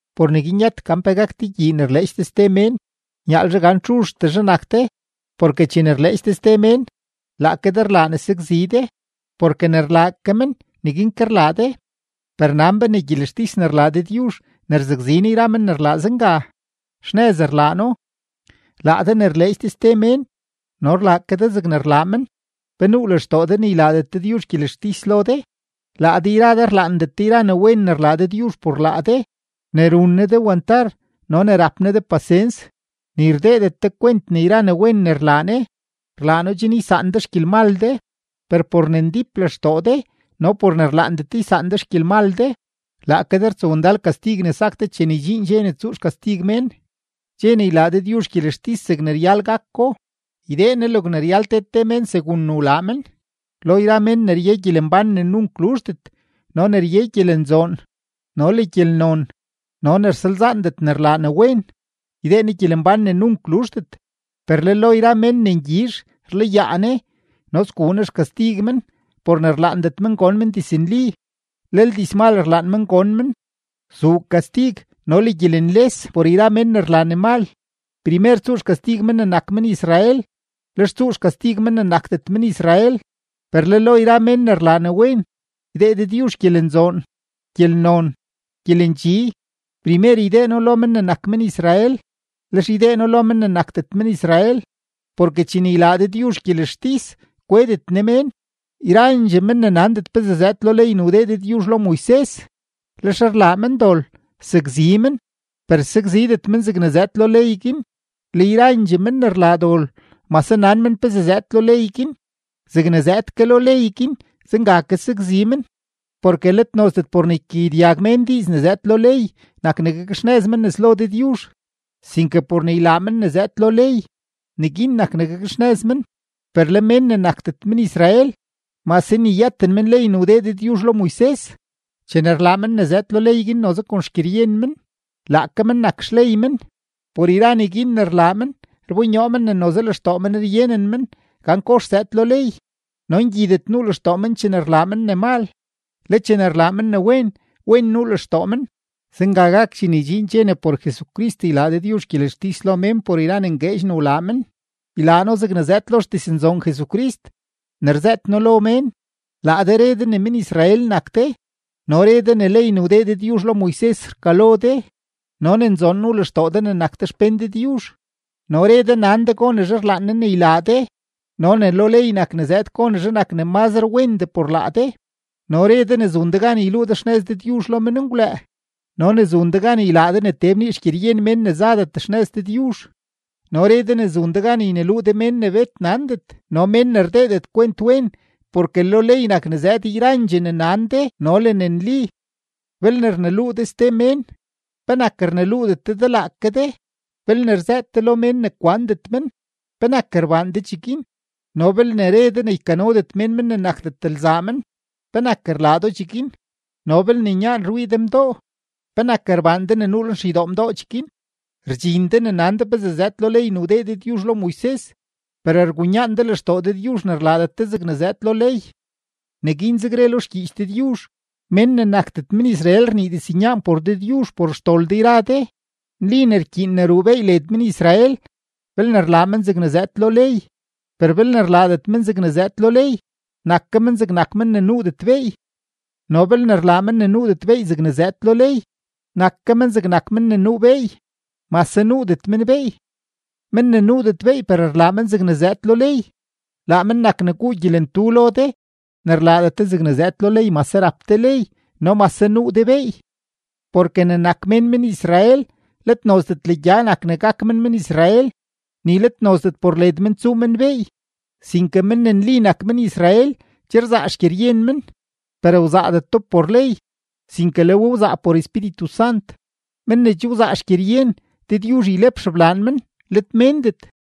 Por neguin yët gan pe gak de gyii ne rleedx de ste mén, nyaalzhe gan txuzhtezhe nak de, porke chene rleedx de ste mén, laake de rlaa ne sakzi de, porke ne rlaa ke men, neguin ke rlaa de. Per nan be ne gyelextis ne rlaa Dëdyuzh ne rzakzi Ne yra men ne rlaa zenga, xnëz rlaa No. Laa de ne rleedx de ste mén no rlaa ke de zegne rlaa men, ¿pe nuu lextoo de ne ylaadet Dëdyuzh gyelextis lo de? Laa de yra de rlaandet de yra ne wen ne rlaa Dëdyuzh por laa de, ne run Ne de wantar no ne rap Ne de pasens, ni rdeedet de kwent ne yra ne wen ne rlaa Ne, rlaa No chen ysaan de xgyelmal de. Per por ne ndíp lextoo de no por ne rlaandet de ysaan de xgyelmal de, laake de rtsowndal kastig ne sak de chene ydxiin dxe ne tsuu xkastig mén, dxe ne ylaa Dëdyuzh gyelextis zegne ryal gako, ydee Ne logne ryal te te mén segun ne wlaa men. Lo yra men ne rye gyelembán ne nunk luzhdet no ne rye gyelenzoon no le gyelnon no ne rsalzaandet ne rlaa ne wen, ydee Ne gyelembán ne nunk luzhdet. Per le lo yra men ne ngyizh rlayaa Ne no sguu Ne xkastig men por ne rlaandet men gon men diznli, lel dizmal rlaan men gon men. Zuu kastig no le gyelenles por yra men ne rlaa ne mal, primer tsuu xkastig men ne nak men-Israel, lex tsuu xkastig men ne nakdet men-Israel. Per le lo yra men ne rlaa ne wen, ydee Dëdyuzh gyelenzoon, gyelnon, gyelendxi, primer ydee No lo men ne nak men-Israel, lex ydee No lo men ne nakdet men-Israel. Porke chene ylaa Dëdyuzh gyelextis, kwedet Ne mén. Yrandxee men ne nandet pezee zëëd lo ley ne wdee Dëdyuzh lo Moises, lex rlaa men dol, sakzi men, per sakzidet men zegne zëëd lo ley guin; le yrandxee men ne rlaa dol mase nan men pezee zëëd lo ley guin, zegne zëëd ke lo ley guin, zenga ke sakzi men. Porke let nozdet por ne ykagyedyag mén diiz ne zëëd lo ley nak ne gakxnëz men nes lo Dëdyuzh, sinke por ne ylaa men ne zëëd lo ley, neguin nak ne gakxnëz men. Per le mén ne nakdet men-Israel, mase ni yëten men ley ne wdee Dëdyuzh lo Moises, chene rlaa men ne zëëd lo ley guin noze kon xgyeryen men, laake men nak xley men. Por yra neguin ne rlaa men rbonyoo men ne noze lenlextoo men ryenen men gan kox zëëd lo ley, no ngyidet nuu lextoo men chene rlaa men ne mal; le chene rlaa men ne wen, wen nuu lextoo men. Zenga gak chene ydxiin dxe ne por Jesucrist ylaa Dëdyuzh gyelextis lo mén por yra ne ngueedx ne wlaa men. Ylaa No zegne zëëd lo xdiznzoon Jesucrist ne rzëët noo lo mén. Laa de re de ne men-Israel nak de no re de ne ley ne wdee Dëdyuzh lo Moises rkalo de no ne nzoon nuu lextoo de ne nak de xpén Dëdyuzh, no re de nan de gonezhe rlaan Ne ne ylaa de no ne lo ley nak ne zëëd gonezhe nak ne mazre wendee por laa de, no re de ne zun de gan yluu de xnëz Dëdyuzh lo menngwlëë no ne zun de gan ylaa de ne tee bnii xgyeryen mén ne zadet xnëz Dëdyuzh, no re de ne zun de gan yneluu de mén ne bet nandet no le mén ne rdeedet kwent wen, porke lo ley nak ne zëëd yrandxee ne nan de no le ne nli. Belne rneluu de ste mén, ¿penak rneluudet de de laake de? Belne rzëët de lo mén ne kwandet men, ¿penak rbaan de cheguin? No belne re de ne ykanodet mén men ne nakdet lzaa men, ¿penak rlaa do cheguin? No belne nyaan rwii de mdoo, ¿penak rbaan de ne nuu lenxeydoo mdoo cheguin? Rdxin de ne nan de pezee zëëd lo ley ne wdee Dëdyuzh lo Moises, per rgunyaan de lextoo Dëdyuzh ne rlaadet de zegne zëëd lo ley. Neguinzeg re lo xgyiich Dëdyuzh: “Mén ne nakdet men-Israel rnii diznyaan por Dëdyuzh por xdol de yra de.” Nli ne rkyiin ne ruu beey led men-Israel, belne rlaa men zegne zëëd lo ley; per belne rlaadet men zegne zëëd lo ley, nak ke men zegnak men ne nuudet beey. No belne rlaa men ne nuudet beey zegne zëëd lo ley, nak ke men zegnak men ne nuu beey, mase nuudet men beey. Men ne nuudet beey per rlaa men zegne zëëd lo ley, laa men nak ne guu gyelentu lo de ne rlaadet de zegne zëëd lo ley, mase rap de ley no mase nuu de beey. Porke ne nak mén men-Israel, let nozdet legya nak ne gak men men-Israel, ni let nozdet por led men tsuu men beey, sinke men ne nli nak men-Israel, che rzaa xgyeryen men, per wzaadeto por ley, sinke le we wzaa por Espíritu Sant. Men ne che wzaa xgyeryen, Dëdyuzh ylep xeblaan men, let méndet.